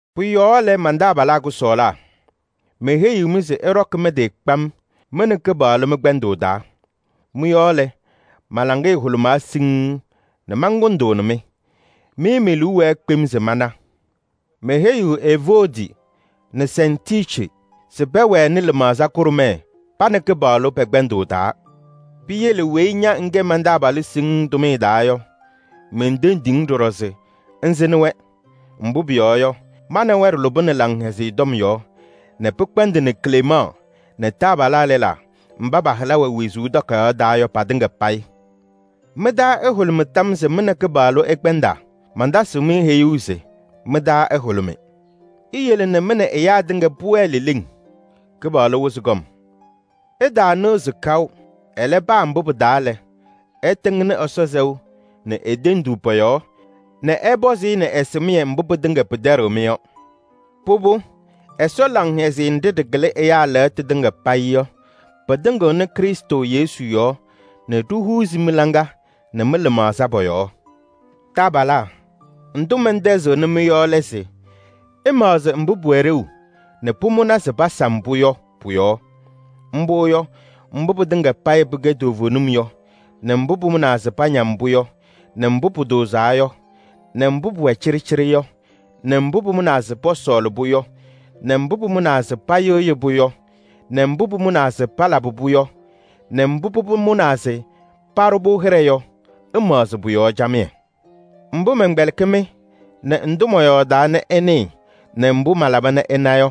Pʋ-yɔɔ lɛ, man-taabalaa kʋsɔɔlaa! Meheyiɣ-mɩ se ɩɖɔkɩ mɩ-tɩ kpam mɩ nɛ Kɩpaɣlʋ mɩ-kpɛndʋʋ taa. Mɩ-yɔɔ lɛ, ma-laŋɩyɛ hʋlʋmaa siŋŋ nɛ mankʋndʋʋnɩ-mɩ. Mɩ me-liu wɛɛ kpem se mana. Meheyiɣ Evoodi nɛ Sɛntiici se pɛwɛnɩ lɩmaɣza kʋɖʋmɛɛ pa nɛ Kɩpaɣlʋ pɛ-kpɛndʋʋ taa. Piyele weyi ña ŋkɛ man-taabalʋ siŋŋ tʋmɩyɛ taa yɔ, mentendiɣ-ŋ ɖɔɖɔ se ŋsɩnɩ-wɛ. Mbʋ pʋyɔɔ yɔ, ma nɛ wɛ ɖɩlʋbɩnɩ Laŋhɛzɩyɛ Tɔm yɔɔ nɛ pɩkpɛndɩnɩ Klemaɣ nɛ taabalaa lɛlaa mba pa-hɩla wɛ wezuu takayaɣ taa yɔ patɩŋa payɩ. Mɩ-taa ɛhʋlʋmɩ tam yɔɔ se mɩ nɛ Kɩpaɣlʋ ɩkpɛndaa. Mantasɩɣ-mɩ heyuu se: mɩ-taa ɛhʋlʋmɩ! Iyele nɛ mɩ nɛ ɛyaa tɩŋa pʋwɛɛ leleŋ, Kɩpaɣlʋ wɩzɩ kɔm. Ɩtaanɩɣzɩ kaʋ. Ɛlɛ, paa mbʋ pɩ-taa lɛ, ɩtɩŋnɩ Ɛsɔ sɛʋ nɛ e-tenduu pɔ-yɔɔ nɛ ɛpɔzɩ-ɩ nɛ ɛsɩmɩyɛ mbʋ pɩtɩŋa pɩtɛɖɩɣ-mɩ yɔ. Pʋbʋ, Ɛsɔ laŋhɛzɩyɛ nɖɩ ɖɩkɩlɩ ɛyaa lɛɣtʋ tɩŋa payɩ yɔ, pɩtɩŋɩɣnɩ Krɩstʋ Yesu yɔɔ nɛ ɖihuuzi mɩ-hɔ nɛ mɩ-lɩmaɣza pɔ-yɔɔ. Taabalaa! Ndʋ mɛntɛzɩɣnɩ-mɩ yɔ lɛ se: ɩmaɣzɩ mbʋ pʋwɛ ɖeu nɛ pʋmʋna se pasam-pʋ yɔ pʋ-yɔɔ. Mbʋ yɔ: mbʋ pɩtɩŋa payɩ pɩkɛ toovenim yɔ nɛ mbʋ pʋmʋnaa se pañam-pʋ yɔ nɛ mbʋ pʋtʋʋzaa yɔ nɛ mbʋ pʋwɛ cɩɖɩcɩɖɩ yɔ nɛ mbʋ pʋmʋnaa se pɔsɔɔlɩ-pʋ yɔ nɛ mbʋ pʋmʋnaa se payɩɣyɩ-pʋ yɔ nɛ mbʋ pʋmʋnaa se palabɩ-pʋ yɔ nɛ mbʋ pʋbʋ mʋnaa se paɖʋ-pʋ hɩɖɛ yɔ. Ɩmaɣzɩ pʋ-yɔɔ camɩyɛ. Mbʋ mɛnkpɛlɩkɩ-mɩ nɛ ndʋ mɔyɔɔdaa nɛ ɩnɩɩ nɛ mbʋ malaba nɛ ɩna yɔ,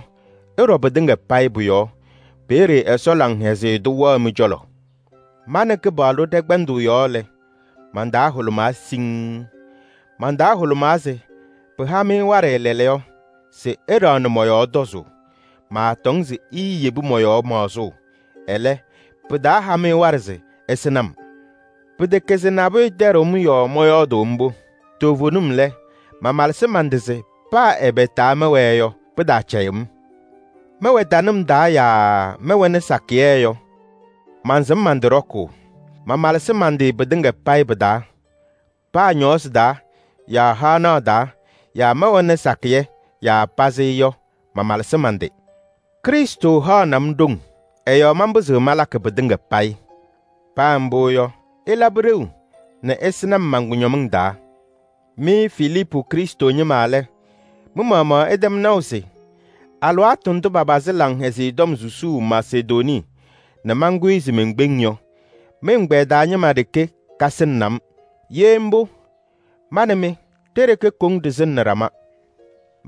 ɩɖɔ pɩtɩŋa payɩ pʋ-yɔɔ. Peeye Ɛsɔ laŋhɛzɩyɛ tʋ wɛɣ mɩ-cɔlɔ. Ma nɛ Kɩpaɣlʋ ɖɛ-kpɛndʋʋ yɔɔ lɛ, man-taa hʋlʋmaa siŋŋ. Man-taa hʋlʋmaa se pɩha-mɩ waɖɛ lɛɛlɛɛyɔ se ɩɖaɣnɩ mɔ-yɔɔ tɔzʋʋ. Maatɔŋ se iiyebi mɔ-yɔɔ maɣzʋʋ, ɛlɛ, pɩtaaha-mɩ waɖɛ se ɩsɩnɩ-m. Pɩtɛkɛ se nabʋyʋ tɛɖɩɣ-m yɔɔ mɔyɔɔdʋʋ mbʋ. Toovenim lɛ, mamalɩsɩ man-tɩ se pa mbʋ pɩ-taa mɛwɛɛ yɔ, pɩtaacɛyɩ-m. Mɛwɛ tanɩm taa yaa mɛwɛnɩ sakɩyɛ yɔ, mansɩm man-tɩ ɖɔkʋʋ. Mamalɩsɩ man-tɩ pɩtɩŋa payɩ pɩ-taa: paa ñɔɔsɩ taa yaa haɣnaɣ taa yaa mɛwɛnɩ sakɩyɛ yaa pazɩ yɔ, mamalɩsɩ man-tɩ. Krɩstʋ haɣnɩ-m ɖoŋ, ɛ-yɔɔ manpɩzɩɣ malakɩ pɩtɩŋa payɩ. Paa mbʋ yɔ, ɩlabɩ ɖeu nɛ ɩsɩnɩ-m man-kʋñɔmɩŋ taa. Mɩ Filiipu Krɩstʋ ñɩma lɛ, mɩ-maɣmaɣ ɩtɛm naʋ se: alɩwaatʋ ndʋ papazɩ Laŋhɛzɩyɛ Tɔm susuu Masedonii nɛ mankʋyɩ se menkpeŋ yɔ, mɩ-ɛgbɛyɛ taa ñɩma ɖeke kasɩnɩnɩ-m. Ye mbʋ, ma nɛ mɩ ɖe-ɖeke koŋ ɖɩsɩnɩnɩ ɖama.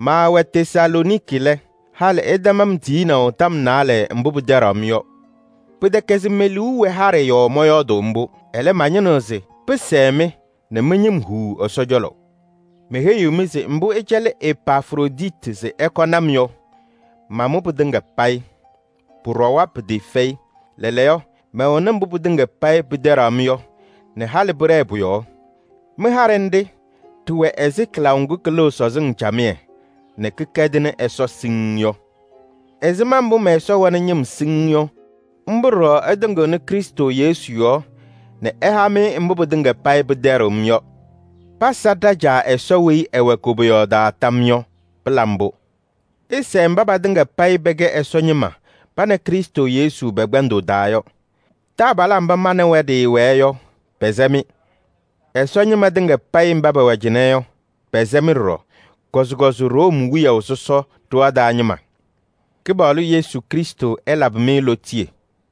Maawɛ Tesalooniki lɛ, halɩ ɩtɛm-m tiyinaʋ tɔm naalɛ mbʋ pɩtɛɖaɣ-m yɔ. Pɩtɛkɛ se me-liu wɛ haɖɛ yɔɔ mɔyɔɔdʋʋ mbʋ. Ɛlɛ, mañɩnɩɣ se pɩsɛɛ-mɩ nɛ mɩ-ñɩm huu Ɛsɔ cɔlɔ. Meheyiɣ-mɩ se mbʋ ɩcɛlɩ Epafroditi se ɛkɔnɩ-m yɔ, mamʋ pɩtɩŋa payɩ. Pʋɖɔwa pɩtɩɩfɛyɩ. Lɛɛlɛɛyɔ, mɛwɛnɩ mbʋ pɩtɩŋa payɩ pɩtɛɖaɣ-m yɔ nɛ halɩ pɩɖɛɛ pʋ-yɔɔ. Mɩ-haɖɛ nɖɩ ɖɩwɛ ɛzɩ kɩlaʋ ŋgʋ kɩlɩɣ sɔzɩŋ camɩyɛ nɛ kɩkɛdɩnɩ Ɛsɔ siŋŋ yɔ. Ɛzɩma mbʋ mɛ-Ɛsɔ wɛnɩ ñɩm siŋŋ yɔ, mbʋ ɖɔɖɔ ɛtɩŋɩɣnɩ Krɩstʋ Yesu yɔɔ nɛ ɛha-mɩ mbʋ pɩtɩŋa payɩ pɩtɛɖɩɣ-m yɔ. Pasa ɖa-Caa Ɛsɔ weyi ɛwɛ koboyaɣ taa tam yɔɔ yɔ. Pɩla mbʋ! Ɩsɛɛ mba patɩŋa payɩ pɛkɛ Ɛsɔ ñɩma pa nɛ Krɩstʋ Yesu pɛ-kpɛndʋʋ taa yɔ. Taabalaa mba ma nɛ wɛ ɖɩwɛɛ yɔ, pɛsɛ-mɩ. Ɛsɔ ñɩma tɩŋa payɩ mba pɛwɛ cɩnɛ yɔ, pɛsɛ-mɩ ɖɔɖɔ. Kɔzɩkɔzɩ Room wiyaʋ sɔsɔ ɖɩɣa taa ñɩma. Kɩpaɣlʋ Yesu Krɩstʋ ɛlabɩ-mɩ lootiye.